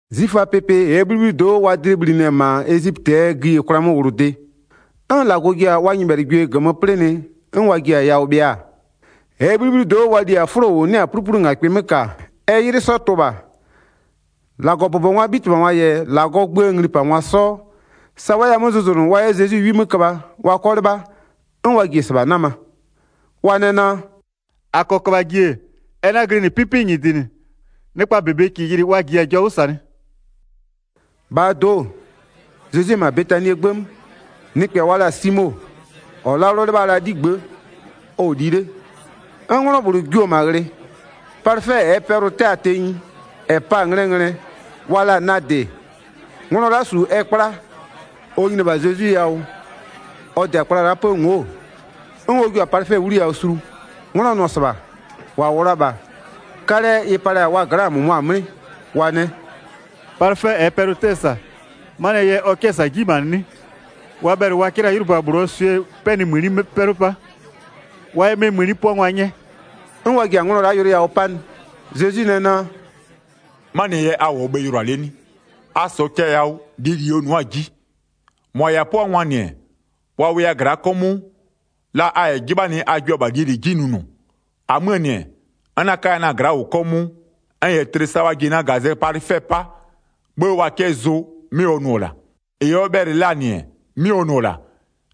'Zwiföaa pɩpɩ -ɛɛ 'bhlibhlido'o wa dlɩ bhlinɩ-ɛ -ma Ezipötɩɛ gïyikwlaa 'möwlʋde, 'n -Lagɔ ji-a wa 'wʋkpɩanɩgwie -gömö 'plɩnɩ, 'n wa ji-a yawʋ bhɩa-a, -ɛɛ 'bhlibhlido'o wa li-a 'fʋlo -ʋ 'nɩ-a 'pluplungakpɩ 'mö -ka-a, ɛ 'ylɩ 'sɔ tʋ-ʋ -bha, -Lagɔbʋbɔngwaa 'bhitɩbhangwa -yɛ -Lagɔɔ gböö nglipangwa 'sɔ, sa wa 'yɛ-a 'mö zʋzʋnʋ wa 'yɛ Zezwi 'wi 'mö köbha, wa 'kɔ 'lɩbha, 'n wa ji-e -sɩbha 'nama. Wa nɛ naa: “-A -kɔɔ köbhaa ji-e, ɛ 'na-a glɩnɩ 'pɩpɩ -nyɩdɩ -nɩ, nɩkpa -bebe -kɩɩ yɩlɩ wa -jiya-a jɔ 'wʋ -sanɩ.” 'Nglɔ -bhlʋ yɛ Zezwi palɩfɛ 'wliyawʋ palɩ 3-Bhaa do'o, Zezwi-e -ma Betanie 'gbë 'mö, nɩkpɛ wa la-a Simo, -ɔ 'lalʋ 'lɩbha la-aa 'ligbë'ë, ɔ-ɔ li 'le, 'n 'nglɔ -bhlʋ jio-o -ma ghlɩ. Palɩfɛ -ɛɛ pɛlʋ-ʋ 'tɛ-a tenyi, -ɛ pa-a nglɛɛ nglɛ, wa la-a nadɩ, nglɔ la'a -su ɛ 'kpla. Ɔ nyini-e -bha Zezwi yawʋ ɔ -dɩ-a kpla la'a 'pë ngo'o, 'n ɔ jio-a palɩfɛ 'wliyawʋ sulu. 'Nglɔ nʋ-ɔ -sɩbha, -wa -wʋ la-a -bha, 'kalɛ ɩ palɩ-a wa gla'aa -mʋmʋa 'mlɩ, wa nɛ: “Palɩfɛ -ɛɛ pɛlʋ-ʋ 'tɛ-ɛ -sa, 'manɩɛ yɛ ɔ 'kɛ-ɛ -sa 'ji nyimanɩ 'nɩ? Wa bhɛlɩ wa 'kɛ la 'ylʋba -bhlʋɔ swɩɛ 'pɛnɩmëni 'mö 'pɛlʋ 'pa, wa 'yɛ 'mɛ mëni 'pʋangwa 'nyɛ.” 'N wa ji-a nglɔ la'a yʋlʋ yawʋ 'panɩ. Zezwi nɛ naa: “'Manɩɛ yɛ a -wʋɔ bhe yʋlʋa 'le 'nɩ? A -sɔɔ cɛ yawʋ, -lie -li ɔ nʋ'ʋ-a 'ji. 7-Mʋa -yɛ-a 'pʋangwa-a, wa wʋya gla'a 'kɔmʋʋ, la a -yɛ 'jɩbhanɩ a jua -bha -lie -li 'ji nʋnʋ. -Amöö -nɩ-ɛ, n 'na 'kaya na-a gla'a -wʋ 'kɔmʋʋ. N -yɛ tlɩ sa wa ji-e na -gazɛ palɩfɛ 'paa, 'bhë wa 'kɛ zʋ 'mɩ ɔ nʋ-ɔ -la. -Ɩ ɔ bhɛlɩ la-a -nɩ-ɛ, 'mɩ ɔ nʋ-ɔ -la.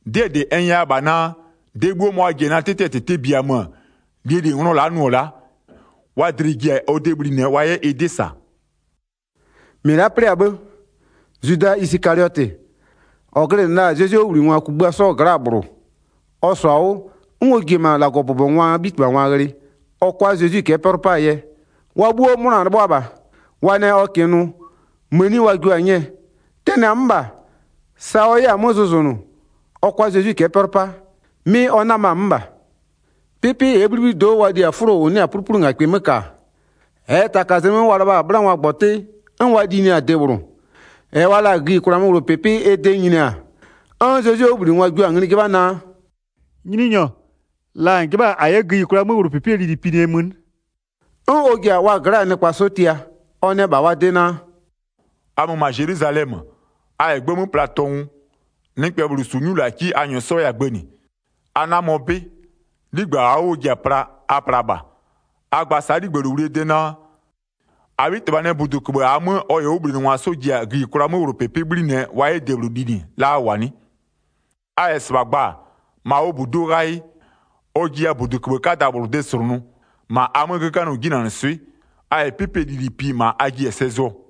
'Dɩɛ -dɩ n nyɛya-a naa, de 'bhuo ma wa ji-a na 'tɩtɩɛ -tɩtɩ biaa mö-ö, -lie -li nglɔ la'a nʋ-ɔ la'a, wa dlɩ-ɩ ji-a ɔ de bhlinɩɛ wa 'yɛ ɩ 'dɩ -sa.” Zwida 'jɩbha ɔ 'yɛ Zezwi -ma ɔ tʋngwa cɛ'ɛ 'pɛlʋ 'pa 10-Mɩ la'a 'plɩ-a 'bhë, Zwida Isɩkaliɔtɩ, -ɔ glɩnɩ la-a Zezwie 'wʋbhlinɩngwa kugbïa 'sɔɔ gla'aa -bhlʋ, ɔ -sɔ-a 'wʋ 'n ɔ ji-e -ma -Lagɔbʋbɔngwaa 'bhitɩbhangwa ghlɩ ɔ 'kʋa Zezwi cɛ'ɛ 'pɛlʋ 'paa yɛ. Wa 'bhuo 'mʋna-a 'lɩbhʋa -bha. Wa nɛ ɔ -kɩɩ nʋ, mëni wa jio-a 'nyɛɛ. Tɛnɩ-a 'mö -bha, sa ɔ 'yɛ-a 'mö zʋzʋnʋ ɔ 'kʋa Zezwi cɛ'ɛ 'pɛlʋ 'pa, 'mɩ ɔ 'nama-a 'mö -bha. Pɩpɩ -ɛɛ 'bhlibhlido'o wa li-a 'fʋlo -ʋ 'nɩ-a 'pluplungakpɩ 'mö -ka, -ɛɛ taka zlɩ 'mö wa lɩbha-a 'bhlangɔgbɔtɩ 'n wa linɩ-a debhlʋ, -ɛ wa la-a gïyikwlaa 'möwlʋpɩpɩ ɛ de nyini-a, 'n Zezwie 'wʋbhlinɩngwa jio-a ngli 'jɩbha naa: “Nyininyɔ, la -n 'jɩbha-a -a 'yɛ gïyikwlaa 'möwlʋpɩpɩɛ lili pinɩɛ mö 'nɩ?” 'N ɔ ji-a wa gla'aa nɩkpa 'sɔ tia, ɔ nɛ -bha wa de naa: “A mö -ma Zelwizalɛmö. A -yɛ 'gbë 'mö pla tɔngʋ, nɩkpɛ -bhlʋ -su 'nyulaki 'n a -nyɔɔ 'yɛ-a gbënɩ. A 'namɔ 'bɩ, 'ligbë -aa 'wʋ ɔ ji-a pla, a plaa -bha. A gba sa'a -bha 'ligbëlowlie de naa: -Abhitɩbha nɛ -buduköbhë -aa 'mö ɔ -yɛ ɔ 'wʋbhlinɩngwa 'sɔ ji-a gïyikwlaa 'möwlʋpɩpɩ 'bhlinɩɛ wa 'yɛ debhlʋ linɩ la a -wʋ-a 'nɩ? A -yɛ -sɩbha gba-a, -ma ɔ -buduo ghayɩ, ɔ jiya -buduköbhë 'kada -bhlʋ de -slʋnʋ, -ma a 'mö 'göganɩɔ 'jinanɩswɩ'ɩ. A -yɛ 'pɩpɩɛ lili pi, -ma a jiɩ-a sɛ zʋɔ.”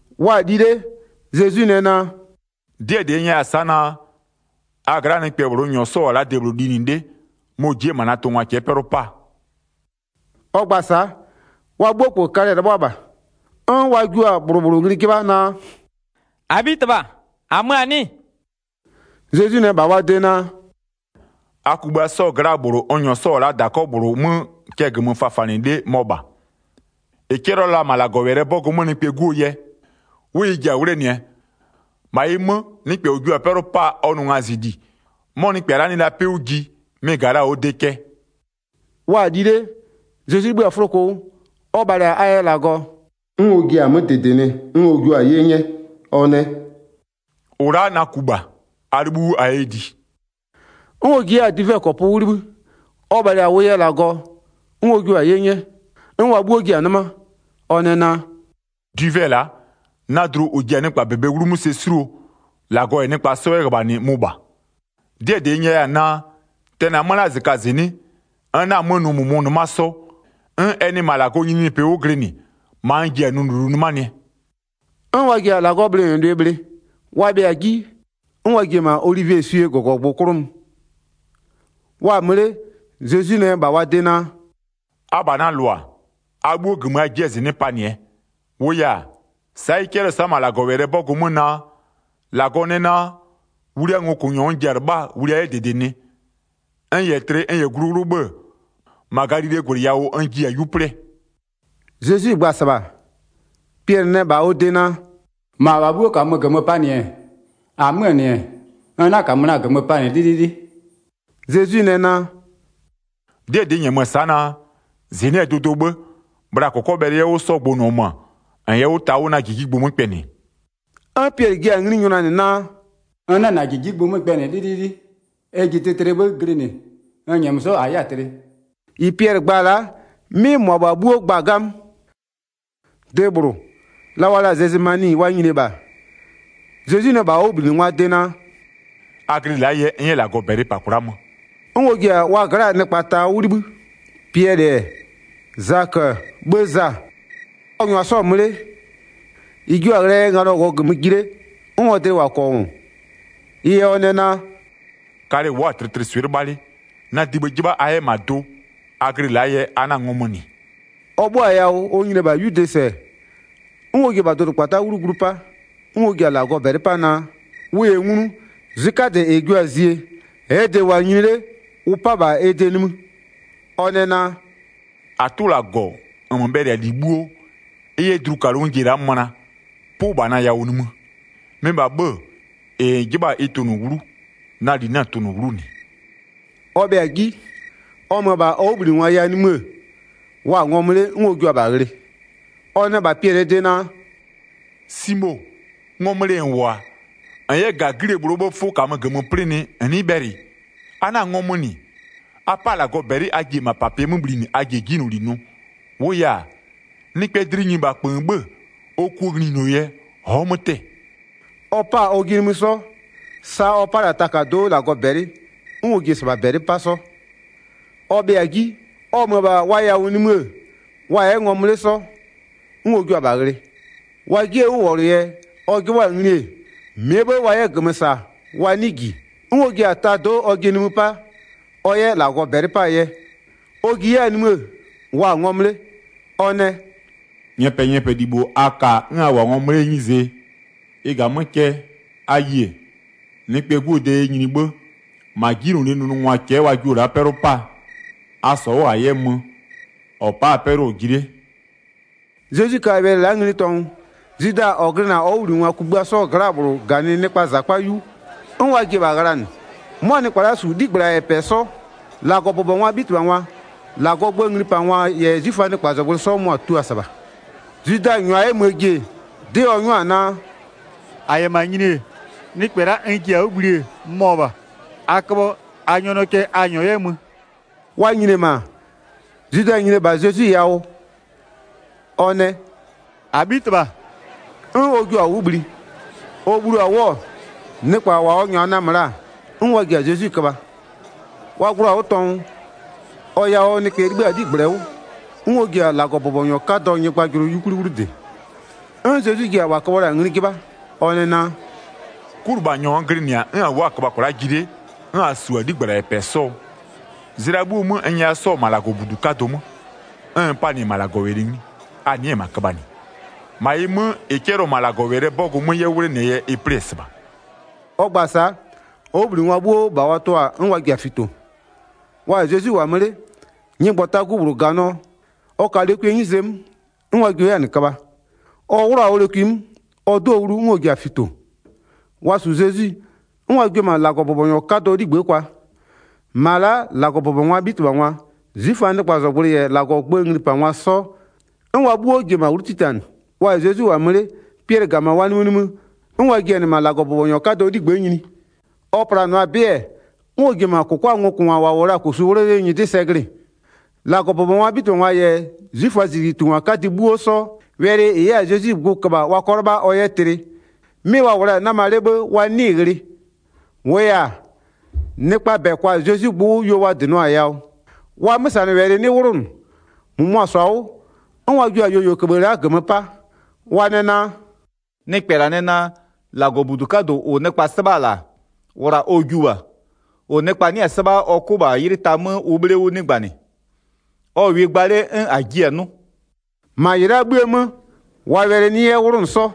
Wa-a li 'le, Zezwi nɛ naa: “'Dɩɛ -dɩ n nyɛya-a sa'a naa, a gla'aa nɩkpɛ -bhlʋ n -nyɔɔ -wʋ-ɔ la'a debhlʋ linɩ 'le mɔ-ɔ ji'i-e -ma na tʋngwa cɛ'ɛ 'pɛlʋ 'paa.” Ɔ gba-a sa'a, wa 'bhuo -kpö kalɛ-ɛ 'lɩbhʋa -bha. 'N wa jio-a -bhlʋ -bhlʋ ngli 'jɩbha naa: “-Abhitɩbha, -amö-a 'nɩ-ɩ?” Zezwi nɛ -bha wa de naa: “A kugbïa 'sɔɔ gla'aa -bhlʋ n -nyɔɔ -wʋ-ɔ la'a -dakɔ -bhlʋ 'mö cɛ -gömö fafanɩ 'le mɔ -bha. 21-Ɩ 'cɛlɩɔ la-a -ma -Lagɔwɛlɩɛ 'bɔgʋ 'mö Nɩkpɛɛ 'Guo yɛ, 'wʋ ɩ ji-a 'wlenɩɛ. -Ma ɩ 'mö, nɩkpɛ -ɔ jio-a 'pɛlʋ 'paa ɔ nʋ ngazɩli, 'mɔ nɩkpɛ la'a nɩ la 'pɩ 'wʋ ji, mɩ-ɩ -ga la-a ɔ de cɛ.” Wa-a li 'le, Zezwi 'libhï-a 'fʋloko 'wʋ, ɔ bhalɩ-a a yɛ -Lagɔ-ɔ, 'n ɔ jia-a 'mö -dɩdɩnɩ 'n ɔ jua-a 'ye 'nyɛ. Ɔ nɛ: “-Ʋ la'a na ku -bha, a 'libhïʋ 'wʋ a 'yɛ li.” 'N ɔ ji 'yɛ-a dwivɛkɔpʋ 'wʋ 'libhï, ɔ bhalɩ-a ʋ yɛ -Lagɔ-ɔ, 'n ɔ jua-a 'ye 'nyɛ, 'n wa 'bhuo ji-a 'nɩma. Ɔ nɛ naa: “Dwivɛ la'a, na dlu -ʋ ji-a nɩkpa -bebee 'wlumö sɛ 'suluo, -Lagɔ -yɛ nɩkpa 'sɔ 'yɛ -ghöbhanɩ mʋ -bha. 'Dɩɛ -dɩ n 'nyɛya-a naa, tɛnɩ-a 'mö la'a -zɩkazɩnɩ'ɩ, n 'na-a 'mö nʋ -mʋmʋ-ʋ 'nɩma 'sɔ, 'n ɛ nɩ -ma -Lagɔɔ nyininyinipɩ 'wʋ glɩnɩ, -ma n ji-a nʋ -lulu 'nɩmanɩɛ.” 'N wa ji-a -Lagɔɔ bhlɩnɩlʋɩ bhlɩ. Wa bhɩa-a 'ji, 'n wa ji-e -ma olivieswie -gɔgɔgbʋ 'klʋ mö. Wa-a mö 'le, Zezwi nɛ -bha wa de naa: “Abha na -lʋa, a 'bhuo, -gömö a ji'i-a -zɩnɩ'ɩ panɩɛ. -Wʋʋ yɛ-a, sa'a ɩ 'cɛlɩɔ-ɔ sa'a -ma -Lagɔwɛlɩɛ 'bɔgʋ 'mö naa: -Lagɔ nɛ naa: Wliaa ngokʋnyɔ n ji-a 'lɩbhaa wlia 'yɛ -dɩdɩnɩ. N -yɛ tlɩ n -yɛ glu 'wlʋ 'bhë-ë, -ma Galilee -gwlɩ yawʋ n ji-a 'yu 'plɩɛ.” Zezwi gba-a -sɩbha, Piɛlɩ nɛ -bha ɔ de naa: “-Mʋabha 'bhuo -kamö -gömö panɩ-ɛ, -amöö -nɩ, n 'na -kamö na-a -gömö panɩ 'lɩlɩlɩ.” Zezwi nɛ naa: “'Dɩɛ -dɩ n -nyɛmö-ö sa'a naa, -zɩnɩ'ɩɛ dʋdʋɔ 'bhë, bhla -kɔkɔbhɛlʋ 'yɛ 'wʋ 'sɔ gbʋnʋɔ mö, -n yɛ 'wʋ ta na -jijigbʋ 'mö kpɛnɩ.” 'N Piɛlɩ jiɩ-a ngli nyʋnanɩ naa: “ N 'na -na -jijigbʋ 'mö kpɛnɩ 'lɩlɩlɩ. Ɛ ji tlɩtlɩɛ 'bhë glɩnɩ, n -nyɛmö 'sɔ -a 'yɛ-a tlɩ.” -Ɩ Piɛlɩ gba-a la'a 'mɩ -mʋabha 'bhuo gba-a 'gamö. De -bhlʋ, la wa la-a Gɛsɩmani wa nyini-e -bha, Zezwi nɛ -bha ɔ 'wʋbhlinɩngwaa de naa: “A glɩ la'a yɛ, n 'yɛ -Lagɔ -bɛlɩ -pa kwla'a mö.” 'N ɔ ji-a wa gla'aa nɩkpa ta 'wʋ 'libhï, Piɛlɩ-ɛ, Zakö-ö 'bhë Za. Ɔ -nyʋa 'sɔ-ɔ mö 'le, -ɩ jio-a ghlɩɛ yɛ nganɔ -wʋɔ -gömö ji 'le, 'n ɔ dlɩ -wʋ-a -kɔngʋ, ɩ yɛ ɔ nɛ naa: “Kalɛ-ɛ wʋ'ʋ-a tlɩtlɩswɩ'ɩ 'lɩbha 'le, na dibhë 'jɩbha a 'yɛ -ma do. A glɩ la'a yɛ a 'na-a ngɔmö -nɩ.” Ɔ 'bhʋa-a yawʋ ɔ nyini-e -bha 'yude -sɛ, 'n ɔ ji-e -bha dʋdʋkpata'a 'wlu glu 'pa, 'n ɔ ji-a -Lagɔ -bɛlɩ 'pa naa, ʋ -yɛ nglu, zwɩ 'kadɛ -ɛ jio-a zie, -ɛɛ de-e -wʋ-a nyini 'le, ʋ 'pa -bha ɛ de nimï. Ɔ nɛ naa: “-Atʋ -Lagɔ -nmö bhɛlɩ-a -li 'bhuo, ɩ yɛ dlukalʋ n ji-e la'a möna, 'pʋ -bha na yawʋ nimï. Mɩ -bha 'bhë-ë, -ɩ -n 'jɩbha-a ɩ tʋnʋ 'wlu, na -li 'na-a tʋnʋ 'wlu -nɩ.” Ɔ bhɩa-a 'ji, ɔ mö-ö -bha ɔ 'wʋbhlinɩngwa yawʋ nimï-ë, wa-a ngɔmö 'le, 'n ɔ jua-a -bha ghlɩ. Ɔ nɛ -bha Piɛlɩɛ de naa: “Simo, ngɔmö 'le -n -wʋ-a? -N 'yɛ -ga 'glie -bhlʋɔ 'bhëë 'fʋ -kamö -gömö 'plɩnɩ -n 'nɩɩ bhɛlɩ? A 'na-a ngɔmö -nɩ. A 'pa -Lagɔ -bɛlɩ a ji-e -mapapɩɛ 'mö bhlinɩ a ji-e 'jinyloli nʋ. -Wʋʋ yɛ-a, nɩkpɛɛ dlɩ nyini -bha -kpöön 'bhë, ɔ kuo nglinyuno yɛ ɔ'ɔ 'mö 'tɛ-ɛ.” Ɔ 'pa-a ɔjɩ nimï 'sɔ, sa ɔ 'pa la-a takado'o -Lagɔ -bɛlɩ, 'n ɔ ji-e -sɩbha -bɛlɩ 'pa 'sɔ. Ɔ bhɩa-a ji, ɔ mö-ö -bha wa yawʋ nimï-ë, wa-a 'yɛ ngɔmö 'le 'sɔ, 'n ɔ jua-a -bha ghlɩ. Wa 'jiee 'wʋwɔlʋ yɛ, ɔ 'jɩbhʋa-a ngli-e, -mɩɛ 'bhë wa 'yɛ -gömö -sa wa 'nɩɩ -ji. 'N ɔ ji-a tado'o ɔjɩ nimï 'pa, ɔ 'yɛ -Lagɔ -bɛlɩ 'paa yɛ. Ɔ ji 'yɛ-a nimï-ë, wa-a ngɔmö 'le, ɔ nɛ: “Nyɛpɛnyɛpɛlibho a ka-a 'n a -wʋ-a ngɔmö 'lee 'nyizee? Ɩ -ga-a 'mö cɛ, a yie, Nɩkpɛɛ 'Guo de yɛ nyini 'bhë, -ma 'jinylolie nʋnʋngwa cɛ'ɛ wa jio-o la'a 'pɛlʋ 'paa. A -sɔ 'wʋ -a 'yɛ mö, -ɔ pa'a-a 'pɛlʋ-ɔ ji 'le.” Zezwi ka wɛlɩ la'a ngli tɔngʋ, Zwida -ɔ glɩnɩ-a ɔ 'wʋbhlinɩngwa kugbïa 'sɔɔ gla'aa -bhlʋ -ganɩ nɩkpaa -zakpa 'yu, 'n wa ji-e -bha ghlanɩ. 'Mʋa nɩkpa la'a -su 'ligbla -yɛ -pɛ 'sɔ. -Lagɔbʋbɔngwaa 'bhitɩbhangwa-a, -Lagɔɔ gböö nglipangwa -yɛ 'zwiföaa nɩkpazɔgblʋɩ sɔ-ɔ tua la-a -sɩbha. Zwida -nyʋa 'yɛ möö ji-e, 'dɩ ɔ 'nyʋa-a naa: “-A -yɛ -ma nyini-e, nɩkpɛ la'a n ji-a 'wʋ bhlie mɔ -bha. A köbhɔ a nyɔnʋɔ cɛ a -nyɔɔ 'yɛ mö.” Wa nyini-e -ma, Zwida nyini-e -bha Zezwi yawʋ, ɔ nɛ: “-Abhitɩbha!” 'N ɔ jio-a 'wʋ bhli. Ɔ bhlio-a 'wʋ-ɔ, nɩkpa ɔ -nyʋa namö la-a, 'n wa ji-a Zezwi köbha. Wa gbloo-a 'wʋ tɔngʋ, ɔ yawʋɔ nɩkpɛ -bhlʋ 'libhï-a ɔ 'ligblɛ 'wʋ, 'n ɔ ji-a -Lagɔbʋbɔnyɔ 'kadɔɔ nyɩgbajʋlʋ 'yukwli 'wlu -dɩ. 'N Zezwi ji-a -wa köbhɔ la-a ngli 'jɩbha, ɔ nɛ naa: “'Kulɩbhanyɔ n glɩnɩ-a 'n a wʋ'ʋ-a köbha kwla'a ji 'le, 'n a -su-a 'ligbla -yɛ -pɛ 'sɔɔ? Zlɩa 'bhuo 'mö, n nyɛya 'sɔ-ɔ -ma -Lagɔbudu 'kadʋ 'mö, 'n n panɩ-ɛ -ma -Lagɔwɛlɩ ngli, a nɩ'ɩ-ɛ -ma köbhanɩ. -Ma ɩ 'mö, -ɩ 'cɛlɩɔ-ɔ -ma -Lagɔwɛlɩɛ 'bɔgʋ 'mö 'yɛ 'wʋ 'wlenɩɛ yɛ ɩ 'plɩ-ɛ -sɩbha.” Ɔ gba-a sa'a, ɔ 'wʋbhlinɩngwa 'bhuo -bha wa tɩɔ-a, 'n wa ji-a fito. Wa -yɛ Zezwi -wʋ-a mö 'le, nyɩgbɔtagu -bhlʋ -ganɩɔ, ɔ ka lokwie 'nyize 'mö. 'N wa jio 'yɛ-a -nɩ köbha. Ɔ 'wlʋ-a ɔ lokwi 'mö, ɔ 'dɩɔ-ɔ wlu, 'n ɔ ji-a fito. Wa -su Zezwi 'n wa jio-o -ma -Lagɔbʋbɔnyɔ 'kadɔɔ 'ligbë'ë kwa. -Ma la'a -Lagɔbʋbɔngwaa 'bhitɩbhangwa-a, 'zwiföaa nɩkpazɔgblʋɩ -yɛ -Lagɔɔ gböö nglipangwa 'sɔ, 'n wa 'bhuo ji-e -ma 'wlu 'titanɩ. Wa -yɛ Zezwi -wʋ-a mö 'le, Piɛlɩ -ga -ma wa nimïnimï, 'n wa ji-a -nɩ -ma -Lagɔbʋbɔnyɔ 'kadɔɔ 'ligbë'ë nyini. Ɔ planʋa-a 'bɩ-ɛ, 'n ɔ ji-e -ma -kʋkwaa ngokʋngwa -wa -wʋ la-a -kosu 'wʋlɔ 'lee nyɩdɩ sɛ glɩ-ɩ. 55-Lagɔbʋbɔngwaa 'bhitɩbhangwa -yɛ 'zwiföaa -zijlitungwa 'kadɩ 'bhuo 'sɔ, wɛlɩ -ɩ 'yɛ-a Zezwi gbʋ köbha wa 'kɔ 'lɩbha ɔ 'yɛ tlɩ, 'mɩ wa -wʋ la-a 'nama 'le 'bhë wa 'nɩɩ-ɩ ghlɩ. 56-Wʋʋ yɛ-a, nɩkpaa -bɛ kwa-a Zezwi gbʋ 'wʋ yuo wa -dɩnɩɔ-a yawʋ, wa 'mösanɩwɛlɩ 'nɩ 'wlʋnʋ. 57-Mʋmʋa -sɔ-a 'wʋ, 'n wa jio-a yuoyuowɛlɩköbhë la'a -gömö 'pa, wa nɛ naa: “Nɩkpɛ -la nɛ naa, -Lagɔbudu 'kadʋ -ʋ nɩkpa 'sɩbha la-a, wla ɔ jiʋ -bha, -ʋ nɩkpa 'nɩ-a 'sɩbha, ɔ 'kʋ -bha 'ylɩ ta 'mö ʋ 'bhle 'wʋ 'nɩgbanɩ. Ɔ -wɩɩ gba 'le 'n -a jiɩ-a 'nʋ.” 59-Ma -ɩ la'a 'bhïë 'mö, wa wɛlɩ 'nɩ 'yɛ 'wlʋnʋ 'sɔ.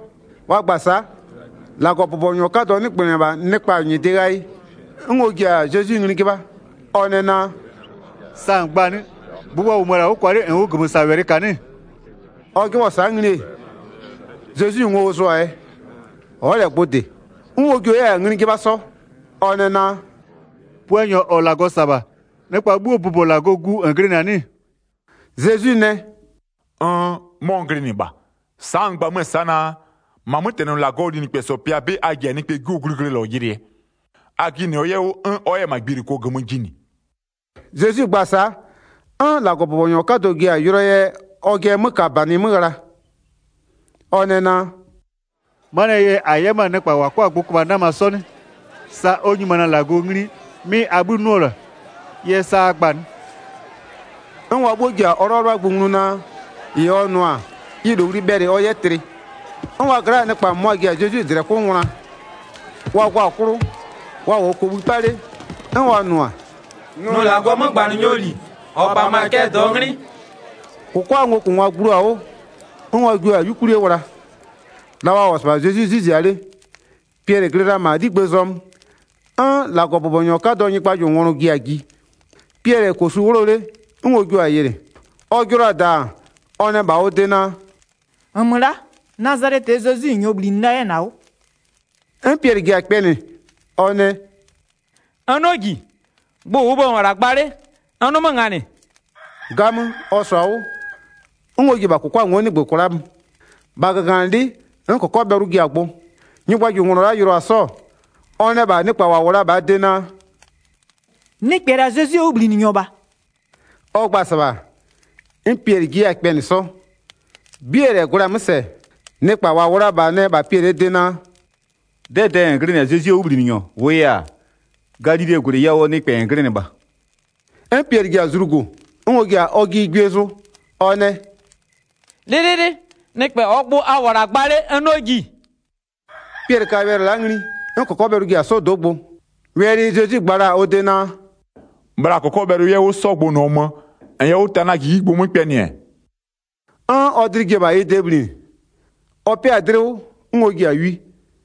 Wa gba-a sa'a, -Lagɔbʋbɔnyɔ 'kadɔ 'nɩgbönɩ-ɛ -bha nɩkpa nyɩdɩ ghayɩ, 'n ɔ ji-a Zezwi ngli 'jɩbha, ɔ nɛ naa: “Sa -n gba-a 'nɩ? Gbʋ wa -wʋmö-ö -la 'wʋ kwa 'le -nn ʋ -gömösawɛlɩ -ka 'nɩ-ɩ?” Ɔ 'jɩbhɔ-ɔ sa'a ngli-e, Zezwi ngo ɔ zʋ-a yɛ, ɔ'ɔ -lɛ gbʋ -dɩ. 'N ɔ jio 'yɛ-a ngli 'jɩbha 'sɔ, ɔ nɛ naa: “Puanyɔ -ɔ -Lagɔ -sa-a -bha, nɩkpa 'bhuoo bʋbɔ -Lagɔɔ Gu -n glɩnɩ-a 'nɩ-ɩ?” Zezwi nɛ: “Nn, 'mɔ n glɩnɩ -bha. Sa'a n gba 'mö-ö sa'a naa: -Ma 'mötɛnɩ -Lagɔɔ linɩkpɛsɔ pɩa 'bɩ a ji-a Nɩkpɛɛ 'Guo glɩglɩlɔ yɩlɩɛ. A jɩnɩɔ 'yɛ 'wʋ, 'n ɔ 'yɛ-a gbiluko -gömö jinɩ.” Zezwi gba-a sa'a, 'n -Lagɔbʋbɔnyɔ 'kadɔ ji-a yʋlʋɔ yɛ ɔjɩɛ 'mökabanɩ 'mö ghla. Ɔ nɛ naa: “'Manɩɛ yɛ -a 'yɛ 'mö-a nɩkpa -wa 'kɔ-a gbʋ köbha 'nama 'sɔ 'nɩ? Sa ɔ nyimanɩ-a -Lagɔ ngli 'mɩ a 'bhï 'nʋ-ɔ -la, ɩ yɛ sa a gba-a 'nɩ?” 'N wa 'bhuo ji-a ɔ 'lɩbhalɩbhagbʋ nglu naa, -ɩ ɔ nʋ-a ɩ -lowli bhɛlɩ ɔ 'yɛ tlɩ. 'N wa gla'aa nɩkpa -mʋmʋa ji-a Zezwi -dlɛ 'klʋ ngwla. Wa gɔ-a 'klʋ, wa -wʋɔ kobhï 'pa 'le, 'n wa nʋ-a: “Nʋ -Lagɔɔ 'mögbanɩnyɔɔ -li, -ɔ -pamö-a cɛ -dɩɔ 'nglɩ.” -Kʋkwaa ngokʋngwa gbloo-a 'wʋ, 'n wa jio-a 'yukwlie wla. La wa -wʋ-ɔ -sɩbha Zezwi 'zwɩ zia 'le, Piɛlɩ glɩ la -ma 'ligbëë zɔmö. 'N -Lagɔbʋbɔnyɔ 'kadɔɔ nyɩgbajʋlʋnglɔ ji-a ji. Piɛlɩ-ɛ -kosu 'wʋlɔ 'le 'n ɔ jio-a yɩlɩ. Ɔ jɩlɔ-a -daan, ɔ nɛ -bha ɔ de naa: “-Nmö la'a, Nazalɛtɩɛ Zezwi -n -nyɔɔ -bhlinɩ la 'yɛ-ɛ -na 'wʋ!” 'N Piɛlɩ ji-a kpɛnɩ ɔ nɛ: “N 'nɩɔ -ji. Gbʋ -ʋʋ bhë -n -wʋ-ɔ -la gba 'le n 'nʋ 'mö -nganɩ.” 'Gamö, ɔ -sɔ-a 'wʋ, 'n ɔ ji-e -bha -kʋkwa ngo'o 'nɩgbö kwla'a mö, -bha -gaganɩlɩ'ɩ, 'n -kɔkɔbhɛlʋ ji-a gbʋ. Nyɩgbajʋlʋnglɔ la'a yɩlɩɔ-a 'sɔ, ɔ nɛ -bha nɩkpa -wa -wʋ la-a -bhaa de naa: “Nɩkpɛ -la Zezwie 'wʋbhlinɩnyɔ -bha.” Ɔ gba-a -sɩbha, 'n Piɛlɩ ji 'yɛ-a kpɛnɩ 'sɔ. 'Bie -lɛ gwlɛ-a 'mö -sɛ, nɩkpa -wa -wʋ la-a -bha nɛ -bha Piɛlɩɛ de naa: “'Dɛdɛɛ -n glɩnɩ-a Zezwie 'wʋbhlinɩnyɔ, -wʋʋ yɛ-a, Galilee -gwlɩ yawʋɔ nɩkpɛ -n glɩnɩ -bha.” 'N Piɛlɩ ji-a zlugo, 'n ɔ ji-a ɔjɩ gwie zʋ. Ɔ nɛ: “'Lɩlɩlɩ, nɩkpɛ -ɔɔ gbʋ a -wʋ-ɔ -la gba 'le, n 'nɩɔ -ji.” Piɛlɩ ka wɛlɩ la'a ngli, 'n -kɔkɔbhɛlʋ ji-a 'sɔdo'o gbʋ. Wɛlɩ Zezwi gba la-a ɔ de naa: “Bhla -kɔkɔbhɛlʋ 'yɛ 'wʋ 'sɔ gbʋnʋɔ mö, -n yɛ 'wʋ ta na -jijigbʋ 'mö kpɛnɩ-ɛ,” 'n ɔ dlɩ ji-e -bha ɩ de bhlinɩ. Ɔ 'pɩ-a dlɩ 'wʋ 'n ɔ ji-a wi.